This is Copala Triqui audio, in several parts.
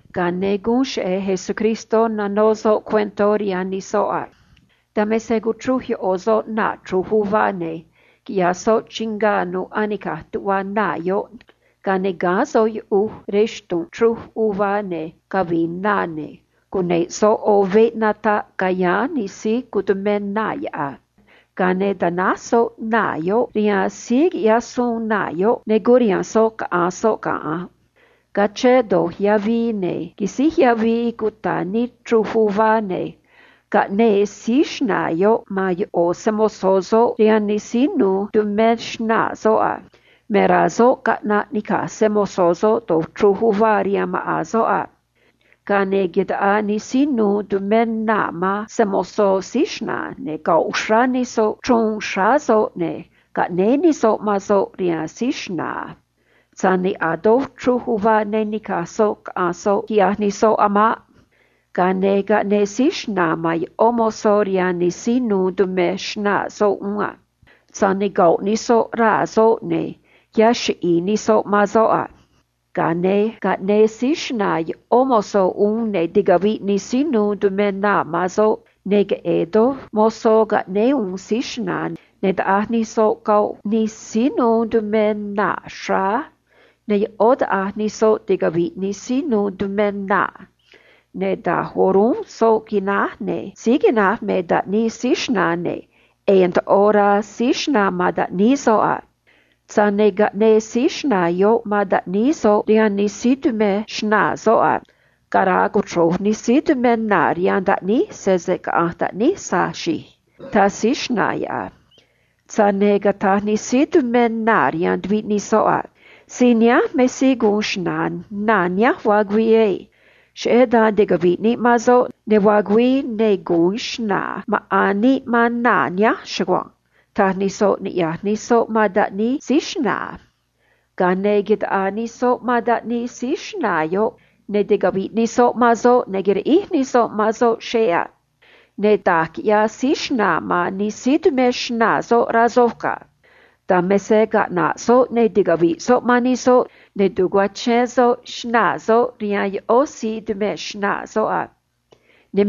Ga̱a ne̱ guun cheꞌe̱ Jesús nanó soꞌ cuentó rihaan nij soꞌ a: ―Dan me se cuchruj ꞌo̱ soꞌ naa̱ chruj uvá, ne̱ quiꞌyaj soꞌ chingá nu̱ꞌ anica̱j tuꞌva naa̱ yoꞌ, ga̱a ne̱ gáán soꞌ yuꞌuj rej xtu̱nꞌ chruj uvá ne̱ cavi̱i̱ na uvá, ne̱ cuneꞌ soꞌ ꞌo̱ veꞌ nataꞌ ca̱yáán nij síí tu̱mé naa̱ yoꞌ a. ’Ga̱a ne̱ tanáj soꞌ naa̱ yoꞌ rihaan nij síí quiꞌya̱j suun naa̱ yoꞌ, ne̱ curiha̱nj soꞌ caꞌanj soꞌ ga̱nꞌ a. Ga̱a quisíj yavii cuta̱ nii chruj uvá, ne̱ caꞌnéé síí xna̱a̱ yoꞌ man ꞌo̱ se‑mo̱zó soꞌ rihaan nij síí nu̱u̱ tumé xnaa̱ soꞌ a. Me rá soꞌ caꞌna̱ꞌ ni̱caj se‑mo̱zó soꞌ taꞌa̱j chruj uvá rihaan maꞌa̱n soꞌ a. ’Ga̱a ne̱ taꞌaa nij síí nu̱u̱ tumé naa̱ man se‑mo̱zó síí xna̱a̱, ne̱ goꞌ uxrá nij soꞌ chruun xráá soꞌ, ne̱ caꞌnéé nij soꞌ man soꞌ rihaan síí xna̱a̱ a. Tza̱j ne̱ a̱ doj chruj uvá ne ni̱caj soꞌ caꞌanj soꞌ, quiꞌyaj nij soꞌ a̱ maꞌ. Ga̱a ne̱ caꞌnéé síí xna̱a̱ man ꞌó mozó rihaan nij síí nu̱u̱ tumé xnaa̱ soꞌ uún a. Tza̱j ne̱ goꞌ nij soꞌ yahij raa̱ soꞌ, ne̱ caxríj naꞌa̱j nij soꞌ man soꞌ a. ’Ga̱a ne̱ caꞌnéé síí xna̱a̱ ꞌó mozó uún, ne̱ ticaviꞌ nij síí nu̱u̱ tumé naa̱ man soꞌ, ne̱ queꞌe̱e̱ doj mozó caꞌnéé uún síí xna̱a̱, ne̱ taꞌa̱j nij soꞌ goꞌ nij síí nu̱u̱ tumé naa̱, ne̱ ꞌó taꞌa̱j nij soꞌ ticaviꞌ nij síí nu̱u̱ tumé naa̱ a. ’Ne̱ da̱j o̱rúnꞌ soꞌ quináj, ne̱ síí quináj me taꞌníí síí xna̱a̱, ne̱ ꞌe̱e̱ ndoꞌo rá síí xna̱a̱ man taꞌníí soꞌ a. Tza̱j ne̱ caꞌnéé síí xna̱a̱ yoꞌ man taꞌníí soꞌ rihaan nij síí tumé xnaa̱ soꞌ, ne̱ cataj soꞌ a: “Cara̱a̱ cochro̱j nij síí tumé naa̱ rihaan taꞌníj sese caꞌa̱nj taꞌníj tza̱j xe̱e̱”, taj síí xna̱a̱ yoꞌ a. ’Tza̱j ne̱ cataj nij síí tumé naa̱ rihaan tuviꞌ nij soꞌ a: “Síí nihánj me síí gu̱un xna̱a̱ naa̱ nihánj vaa güii na̱nj á. Cheꞌé dan ticavi̱ꞌ níꞌ man soꞌ, ne̱ vaa güii, ne̱ gu̱un xna̱a̱ maꞌa̱n níꞌ man naa̱ nihánj chugua̱nj”, taj nij soꞌ niꞌya̱j nij soꞌ man taꞌníí síí xna̱a̱ yoꞌ a. Ga̱a ne̱ taꞌaa nij soꞌ man soꞌ, ne̱ ticaviꞌ nij soꞌ man soꞌ, ne̱ quiriꞌíj nij soꞌ man soꞌ xeꞌ a. ’Ne̱ da̱j quiꞌya̱j síí xna̱a̱ man nij síí tumé xnaa̱ soꞌ, rá soj ga̱. Dan me se caꞌna̱ꞌ soꞌ, ne̱ ticavi̱ꞌ soꞌ man nij soꞌ, ne̱ ta̱cuachén soꞌ xnaa̱ soꞌ rihaan ꞌó nij síí tu̱mé xnaa̱ soꞌ a. Ne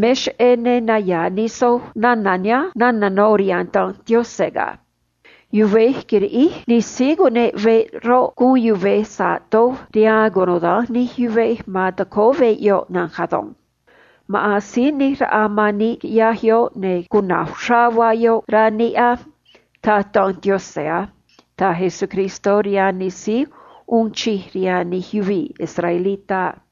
naya̱a̱ nij soj nana̱ nihánj nana̱ no̱ rihaan Danj Yaꞌanj naꞌ: Yuvej quiriꞌíj nij síí cuneꞌ veꞌ roꞌ, guun yuvej sa̱ꞌ vaa se uun doj rihaan cunuda̱nj nij yuvej ma̱n tacóó veꞌ yoꞌ na̱nj ado̱nj. Maꞌa̱n Yaꞌanj Si̱j ꞌNi̱j Raꞌa man níꞌ quiꞌyaj da̱nj, ne̱ cuna̱j uxrá vaa yoꞌ, rá níꞌ ado̱nj, taj Danj Yaꞌanj a ―taj Jesús rihaan nij síí uun chij rihaan nij yuvii̱ israelitá a.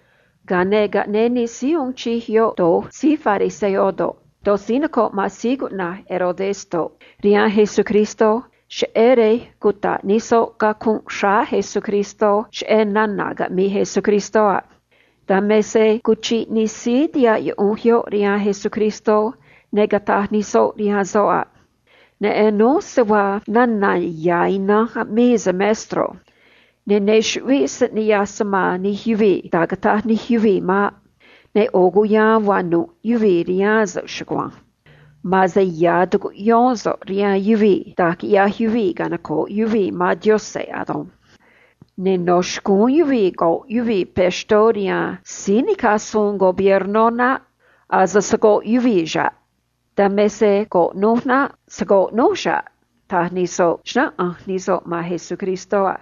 Ga̱a ne̱ caꞌnéé nij síí uun chij yoꞌ do̱j síí fariseo do̱ꞌ, do̱j síí noco̱ꞌ man Herodes do̱ꞌ, rihaan Jesús, cheꞌé rej cuta̱ꞌ nij soꞌ cacunꞌ xráá Jesús cheꞌé nana̱ caꞌmi̱i̱ Jesús a. Dan me se cuchiꞌ nij síí tihaꞌ yuꞌunj yoꞌ rihaan Jesús, ne̱ cataj nij soꞌ rihaan soꞌ a: ―Neꞌen núj se vaa nana̱ ya̱ ina̱nj aꞌmii so̱ꞌ, maestro. Ne̱ ne chuꞌvíꞌ so̱ꞌ niꞌya̱j so̱ꞌ man nij yuvii̱ da̱j cata̱j nij yuvii̱ maꞌ. Ne̱ ꞌo̱ cuya̱a̱n vaa nu̱ꞌ yuvii̱ rihaan so̱ꞌ chugua̱nj. Ma̱an se ya̱ tucuꞌyón so̱ꞌ rihaan yuvii̱ da̱j quiꞌya̱j yuvii̱ canoco̱ꞌ yuvii̱ man Yaꞌanj ado̱nj. Ne̱ no̱ xcúún yuvii̱ rque̱ yuvii̱ impuestó rihaan síí nica̱j suun emperador César naꞌ. Ase se̱ rqué yuvii̱ xa̱ꞌ. Dan me se rque̱ núj naꞌ. Se̱ rqué núj xa̱ꞌ ―taj nij soꞌ a.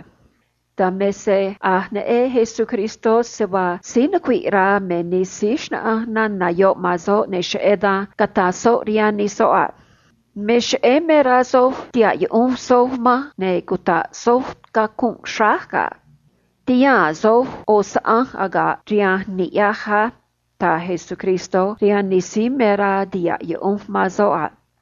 Dan me se a̱j neꞌen Jesús se vaa síí nucuiꞌ rá me nij soꞌ, ne̱ cheꞌé dan cataj soꞌ rihaan nij soꞌ a: ―Me cheꞌé me rá soj tiha̱ꞌ yuꞌunj soj manj ne̱ cuta̱ꞌ soj cacunꞌ xráj ga̱. Ti̱haa̱n soj ꞌo̱ saꞌanj aga̱ꞌ rihanj ni̱ꞌyaj á ―taj Jesús rihaan nij soꞌ a.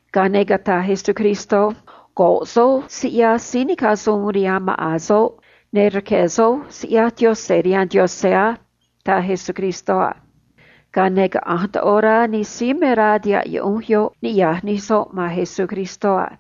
Ga̱a ne̱ cataj Jesús a: ―Rque̱ soj siꞌyaj síí nica̱j suun rihaan maꞌa̱n soꞌ, ne̱ rque̱ soj siꞌyaj Yaꞌanj rihaan Yaꞌanj á ―taj Jesús a. Ga̱a ne̱ caꞌanj ndoꞌo rá nij síí me rá tiha̱ꞌ yuꞌunj yoꞌ niꞌya̱j nij soꞌ man Jesús a.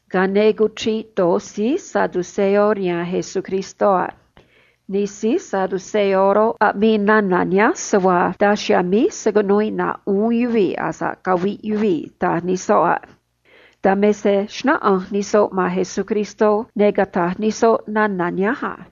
Ga̱a ne̱ cuchiꞌ do̱j síí saduceo rihaan Jesús a. Nij síí saduceo roꞌ, taj se vaa daj chiha̱a̱ míj se̱ cunuu iꞌna̱ꞌ uún yuvii̱ asa̱ꞌ caviꞌ yuvii̱ a. Dan me se xnáꞌanj nij soꞌ man Jesús a: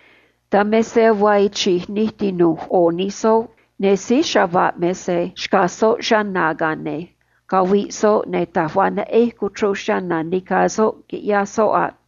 Dan me se vaa chi̱j nij tinu̱j ꞌo̱ nij soꞌ, ne̱ síí chava̱ꞌ me se xcaj soꞌ chana̱, ga̱a ne̱ caviꞌ soꞌ, ne̱ taj va̱j neꞌej cuchruj nica̱ soꞌ, quiꞌyaj soꞌ maꞌ.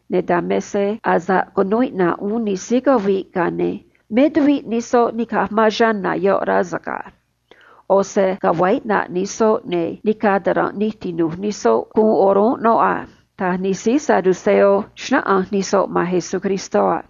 ne̱ dan me se asa̱ꞌ cunuu iꞌna̱ꞌ uún nij síí caviꞌ, ga̱a ne̱ me nij soꞌ ni̱caj man chana̱ yoꞌ, rá so̱ꞌ ga̱. ꞌO̱ se ga̱a vaa iꞌna̱ꞌ nij soꞌ, ne̱ nica̱ ta̱ranꞌ nij tinu̱j nij soꞌ guun noꞌ a ―taj nij síí saduceo, xnáꞌanj nij soꞌ man Jesús a.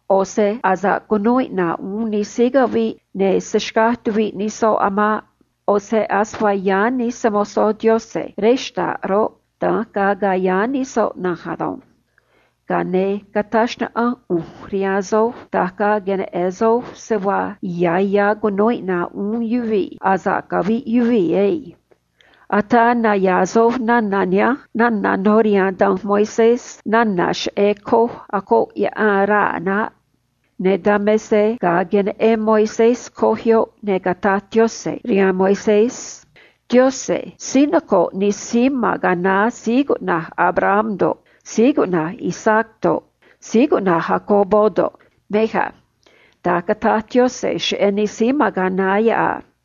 ꞌO̱ se asa̱ꞌ cunuu iꞌna̱ꞌ uún nij síí caviꞌ, ne̱ se̱ xcaj tuviꞌ nij soꞌ a̱ maꞌ. ꞌO̱ se ase vaa nij se‑mo̱zó Yaꞌanj ma̱n rej xta̱ꞌ roꞌ, da̱nj ga̱a̱ nij soꞌ na̱nj ado̱nj. Cata̱j xnaꞌanj ꞌu̱nj rihaan soj da̱j ga̱a̱ queneꞌe̱n soj se vaa ya̱ ya̱ cunu̱u iꞌna̱ꞌ uún yuvii̱ asa̱ꞌ caviꞌ yuvii̱ ado̱nj. Ataa naya̱a̱ soj nana̱ nihánj nana̱ no̱ rihaan danj Moisés nana̱ cheꞌé coj acoꞌ yaꞌan raa̱ naꞌ. Ne̱ dan me se ga̱a queneꞌen Moisés coj yoꞌ, ne̱ cataj Yaꞌanj rihaan Moisés a: “Yaꞌanj noco̱ꞌ nij síí ma̱n ga̱a naá síí cuꞌna̱j Abraham do̱ꞌ, Isaac do̱ꞌ, Jacob do̱ꞌ, mej a.” Da̱nj cataj Yaꞌanj cheꞌé nij síí ma̱n ga̱a naá yoꞌ a.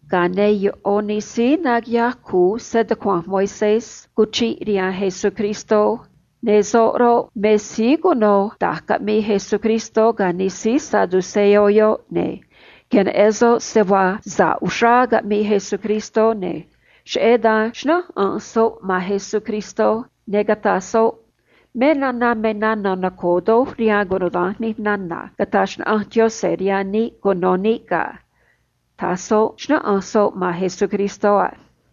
Ga̱a ne̱ ꞌo̱ nij síí naquiꞌyaj cu̱u stucua̱nj Moisés cuchiꞌ rihaan Jesús, ne̱ soꞌ roꞌ, me síí cuno da̱j caꞌmii Jesús ga̱ nij síí saduceo yoꞌ a. Ne̱ queneꞌen soꞌ se vaa sa̱ꞌ uxrá caꞌmii Jesús, ne̱ cheꞌé dan xnáꞌanj soꞌ man Jesús a: ―Me suun me suun noco̱o doj rihaan cunuda̱nj nij suun caꞌneꞌ Yaꞌanj no̱ xcúún níꞌ cuno̱ níꞌ ga̱ ―taj soꞌ a.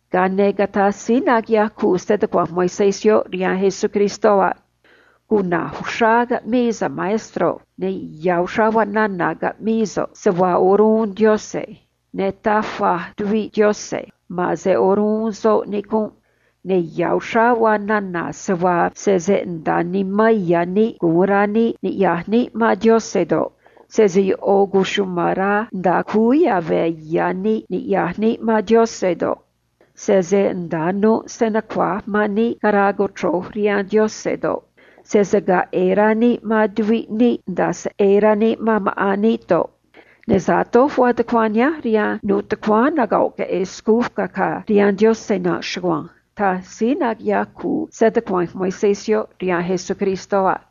Ga̱a ne̱ cataj síí naquiꞌyaj cu̱u stucua̱nj Moisés yoꞌ rihaan Jesús a: ―Cuna̱j uxrá caꞌmii so̱ꞌ, maestro, ne̱ ya̱ uxrá vaa nana̱ caꞌmii so̱ꞌ, se vaa o̱rúnꞌ Yaꞌanj, ne̱ taj va̱j tuviꞌ Yaꞌanj, ma̱an se o̱rúnꞌ soꞌ nicunꞌ a. Ne̱ ya̱ uxrá vaa nana̱ se vaa sese nda̱a nimán ya̱ níꞌ gu̱un rá níꞌ ni̱ꞌyaj níꞌ man Yaꞌanj do̱ꞌ, sese ꞌo̱ cuchuma̱n rá nda̱a cúú yave̱ ya̱ níꞌ ni̱ꞌyaj níꞌ man Yaꞌanj do̱ꞌ, sese nda̱a nu̱ꞌ se nucua̱j man níꞌ cara̱a̱ cochro̱j rihaan Yaꞌanj do̱ꞌ, sese ga̱a̱ ꞌe̱e̱ rá níꞌ man tuviꞌ níꞌ nda̱a se ꞌe̱e̱ rá níꞌ man maꞌa̱n níꞌ do̱ꞌ, ne̱ sa̱ꞌ doj vaa ro̱j suun nihánj rihaan nu̱ꞌ nij xcuu acaa do̱ꞌ, nij xcuu aviꞌ do̱ꞌ, rihaan Yaꞌanj ado̱nj ―taj síí naquiꞌyaj cu̱u stucua̱nj Moisés yoꞌ rihaan Jesús a.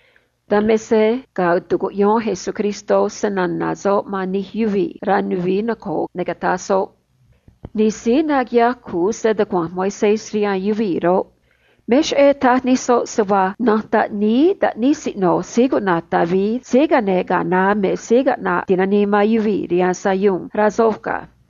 Dan me se ga̱a tucuꞌyón Jesús snana̱ soꞌ man nij yuvii̱ rej ya̱nj nuvií noco̱o, ne̱ cataj soꞌ a: ―Nij síí naquiꞌyaj cu̱u stucua̱nj Moisés roꞌ, me cheꞌé taj nij soꞌ se vaa na̱nj taꞌníí taꞌnij siꞌno̱ rey David me Síí Caꞌne̱j Yaꞌanj Ti̱nanii man Yuvii̱ rihaan Sayuun, rá soj ga̱.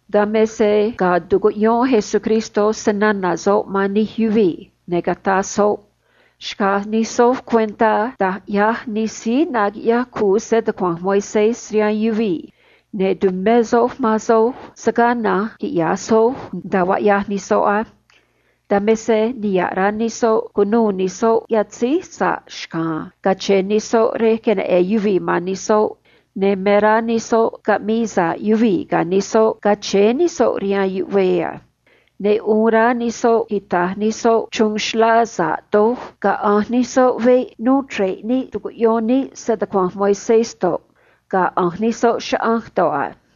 Dan me se ga̱a tucuꞌyón Jesús stucua̱nj soꞌ man nij yuvii̱, ne̱ cataj soꞌ a: ―Xca̱j nij soj cuentá da̱j ꞌyaj nij síí naquiꞌyaj cu̱u stucua̱nj Moisés, ne̱ tu̱mé soj man soj se̱ gaa na̱nj quiꞌya̱j soj nda̱a vaa ꞌyaj nij soꞌ á. Dan me se niha̱ꞌ rá nij soꞌ cu̱nuû nij soꞌ yatzéj sa̱ꞌ xca̱a̱n cache̱e̱ nij soꞌ rej queneꞌe̱n yuvii̱ man nij soꞌ, ne̱ me rá nij soꞌ caꞌmi̱i̱ sa̱ꞌ yuvii̱ ga̱ nij soꞌ ga̱a chéé nij soꞌ rihaan yuꞌvee a. Ne̱ uun rá nij soꞌ quita̱j nij soꞌ chruun xlá sa̱ꞌ doj ga̱a ꞌanj nij soꞌ veꞌ nuu chre̱ꞌ níꞌ tu̱cuꞌyón níꞌ stucua̱nj Moisés do̱ꞌ, ga̱a ꞌanj nij soꞌ chaꞌanj do̱ꞌ a.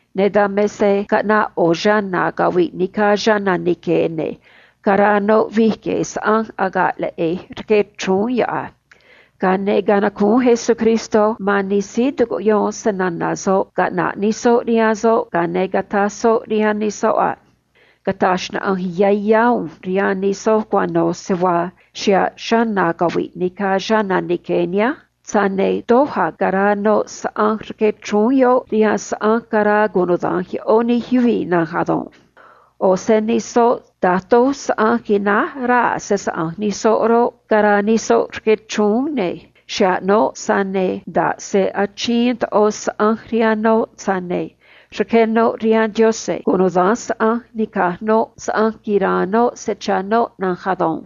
Ne̱ dan me se caꞌnaꞌ ꞌo̱ chana̱ caviꞌ nica̱ chana̱ nique̱, ne̱ caraa noꞌ vi̱j gue̱e̱ saꞌanj aga̱ꞌ leꞌe̱j rque chrúún yoꞌ a. Ga̱a ne̱ canacúún Jesús man nij síí tucuꞌyón snana̱ soꞌ caꞌna̱ꞌ nij soꞌ rihaan soꞌ, ga̱a ne̱ cataj soꞌ rihaan nij soꞌ a: ―Cata̱j xnaꞌanj yá yá ꞌu̱nj rihaan nij soj cuano̱ se vaa xa̱ꞌ chana̱ caviꞌ nica̱ chana̱ nique̱ nihánj, tza̱j ne̱ doj a̱ caraa noꞌ saꞌanj rque chrúún yoꞌ rihaan saꞌanj caraa cunuda̱nj ꞌó nij yuvii̱ na̱nj ado̱nj. ꞌO̱ se nij soꞌ me se da̱j doj saꞌanj quináj raa̱ se‑saꞌa̱nj nij soꞌ roꞌ, caraa nij soꞌ rque chrúún a. Xa̱ꞌ noꞌ, tza̱j ne̱ nda̱ꞌ se achiin ndoꞌo saꞌanj rihaan noꞌ, tza̱j ne̱ rqué noꞌ rihaan Yaꞌanj cunuda̱nj saꞌanj nica̱j noꞌ saꞌanj quira̱a̱n noꞌ se cha̱ noꞌ na̱nj ado̱nj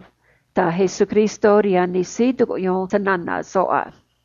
―taj Jesús a.